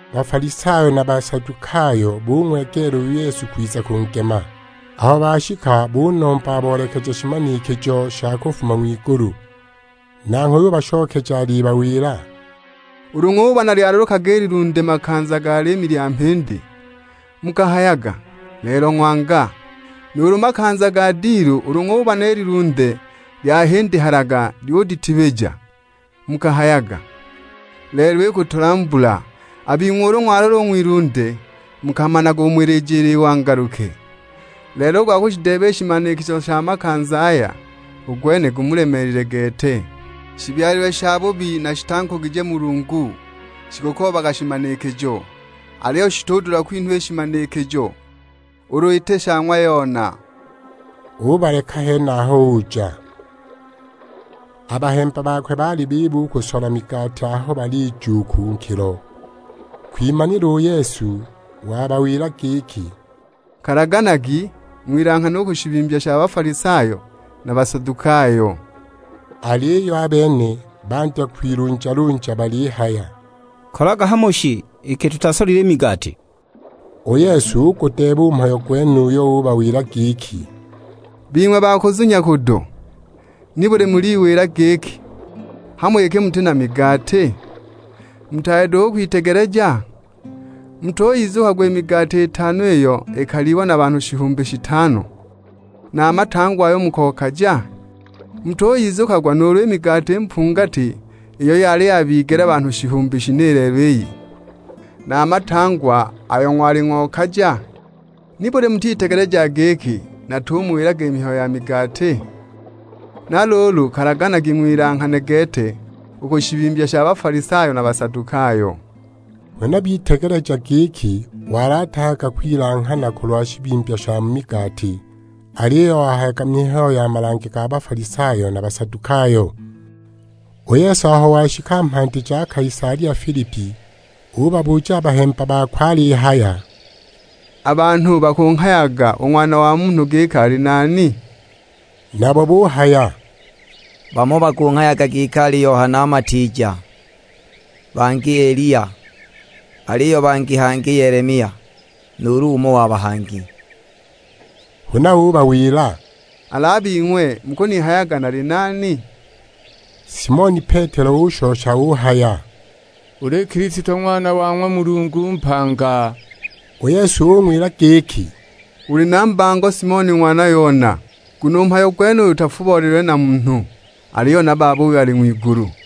Bafalisayo na Basadukayo bung'wegeela u Yesu kwiza kungema; aho bashika bunomba aboolekeje shimanikijo sha kufuma ng'wigulu. Nanghwe ubashokeja alibawila, "Ulu ng'ubona lyalalukaga i lilunde makanza ga liimi lya mhindi, mukahayaga; 'Lelo ng'wanga.' Nuulu makanza ga dilu ulu ng'ulibona i lilunde lyahindihalaga lyuditibija, mukahayaga; 'Lelo ikutula mbula.' A bing'we ulu ng'walola u ng'wilunde mukamanaga umo ilijila i wangaluke, lelo u gwa kushideeba i shimanikijo sha makanza aya u gwene gumulemeelile gete! Shibyalilwe shabubi na shitankugije Mulungu, shikukoobaga shimanikijo. Aliyo shitudula kwinhwa i shimanikijo, ulu iti sha ng'wa Yona!" Ubaleka henaho uja. A bahemba bakwe baali biba u kusola migati aho balija u ku nkilo. Kwimanila u Yesu wabawila giki, "Kalaganagi, ng'wilanghane u ku shibimbya sha Bafalisayo na Basadukayo." Aliyo a bene bandya kwilunjalunja balihaya, "Kolaga hamo shi iki tutasolile i migati!" U Yesu ugudeeba u mhayo gwenuyo, ubawila giki, "Bing'we ba kuzunya kudo, nibuli muliwila giki, hamo iki muti na migati? Mutaali duhu u kwitegeleja? Mutuyizukagwa i migati itano iyo ikalyiwa na banhu shihumbi shitano, na a matangwa ayo mukokaja? Mutuyizukagwa nuulu i migati mpungati iyo yali yabigela banhu shihumbi shine lelo iyi, na a matangwa ayo ng'wali ng'okaja? Nibuli mutitegelejaga giki natumuwilaga mihayo ya migati? Na luulu kalaganagi ng'wilanghane gete u ku shibimbya sha Bafalisayo na Basadukayo!" Huna bitegeleja giki wali atahayaga kwilanghana kulwa shibimbya sha mu migati, aliyo wahayaga mihayo ya malange ga Bafalisayo na Basadukayo. U Yesu aho washika mhandi ja Kaisalia Filipi, ubabuja a bahemba bakwe alihaya, "A banhu bakunghayaga u Ng'wana wa Munhu giki ali nani?" Nabo buhaya, "Bamo bakunghayaga giki ali Yohana Matiija, bangi Eliya, aliyo bangi hangi Yelemia, nuulu umo wa bahangi." Huna ubawila, "Al'a bing'we mukunihayaga nali nani?" Simoni Petelo ushosha uhaya, "Uli Kilisto Ng'wana wa ng'wa Mulungu mpanga!" U Yesu ung'wila giki, "Uli na mbango Simoni ng'wana Yona, nguno u mhayo gwenuyu utafubolelilwe na munhu, aliyo na Baba uyo ali ng'wigulu.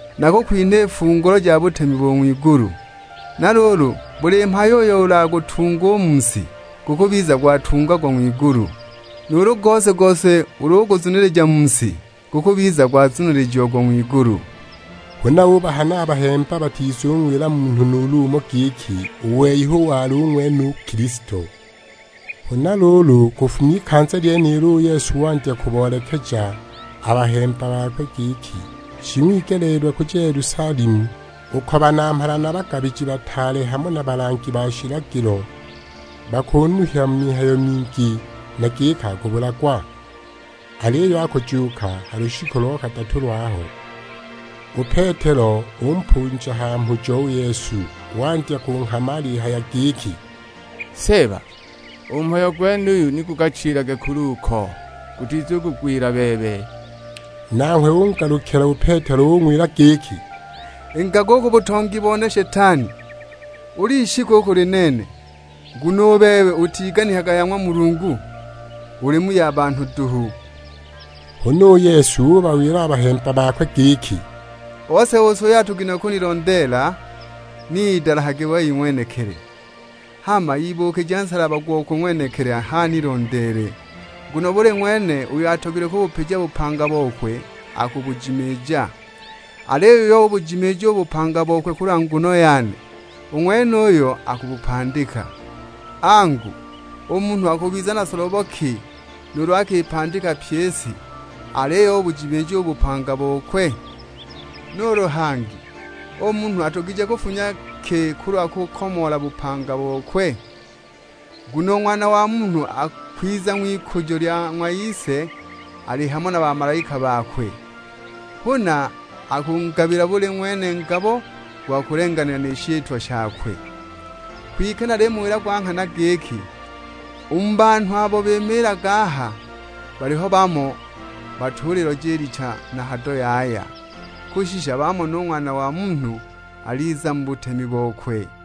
Nakukwinha i fungulo ja butemi bo ng'wigulu, na luulu buli mhayo uyo ulagutunge u mu si, gukubiza gwatungagwa ng'wigulu, nuulu gose-gose ulu uguzunilija mu si, gukubiza gwazunilijiagwa ng'wigulu." Huna ubahana a bahemba batizung'wila munhu nuulu umo, giki u wei hu wali ng'wene u Kilisto. Huna luulu kufuma ikanza lyenilo, u Yesu wandya kuboolekeja a bahemba bakwe, giki shing'wigeleelilwe kuja Yelusalemu, uko banamhala na bagabiji bataale hamo na balangi ba shilagilo bakunuhya mu mihayo mingi; na giki akubulagwa. Aliyo akujuuka ha lushiku lo kadatu lwaho. U Petelo umpunja ha mhujo u Yesu, wandya kunghama alihaya giki, "Seeba, u mhayo gwenuyo ni gukachilage kule uko, gutizukugwila bebe!" Nanghwe ungalukila u Petelo ung'wila giki, "Ingaga u ku butongi bone Shetani. Uli ishiki u kuli nene; nguno u bebe utiganikaga ya ng'wa Mulungu, uli mu ya banhu duhu!" Huna u Yesu ubawila a bahemba bakwe giki, "Ose-ose uyo atogilwe kunilondeela ni idalahage wei ng'wenekili, hama ibuukije nsalaba gokwe ng'wenekili h'anilondeele. Nguno buli ng'wene uyo atogilwe kubupija bupanga bokwe akubujimiija, aliyo uyo ubujimiija u bupanga bokwe kulwa nguno yane, u ng'wenuyo akubupandika. Angu, u munhu akubiza na solobo ki nuulu akipandika pyi i si, aliyo ubujimiija u bupanga bokwe? Nuulu hangi, u munhu adugije kufunya ki kulwa kukomoola bupanga bokwe? Nguno u Ng'wana wa Munhu akwiza ng'wikujo lya ng'wa Ise ali hamo na bamalaika bakwe; huna akungabila buli ng'wene ngabo gwa kulenganila na shitwa shakwe. Kwike nalimuwila gwa nghana giki, u mu banhu abo bimiilaga aha, baliho bamo batuliloja i licha na hado yaya, kushisha bamone u Ng'wana wa Munhu aliza mu butemi bokwe!"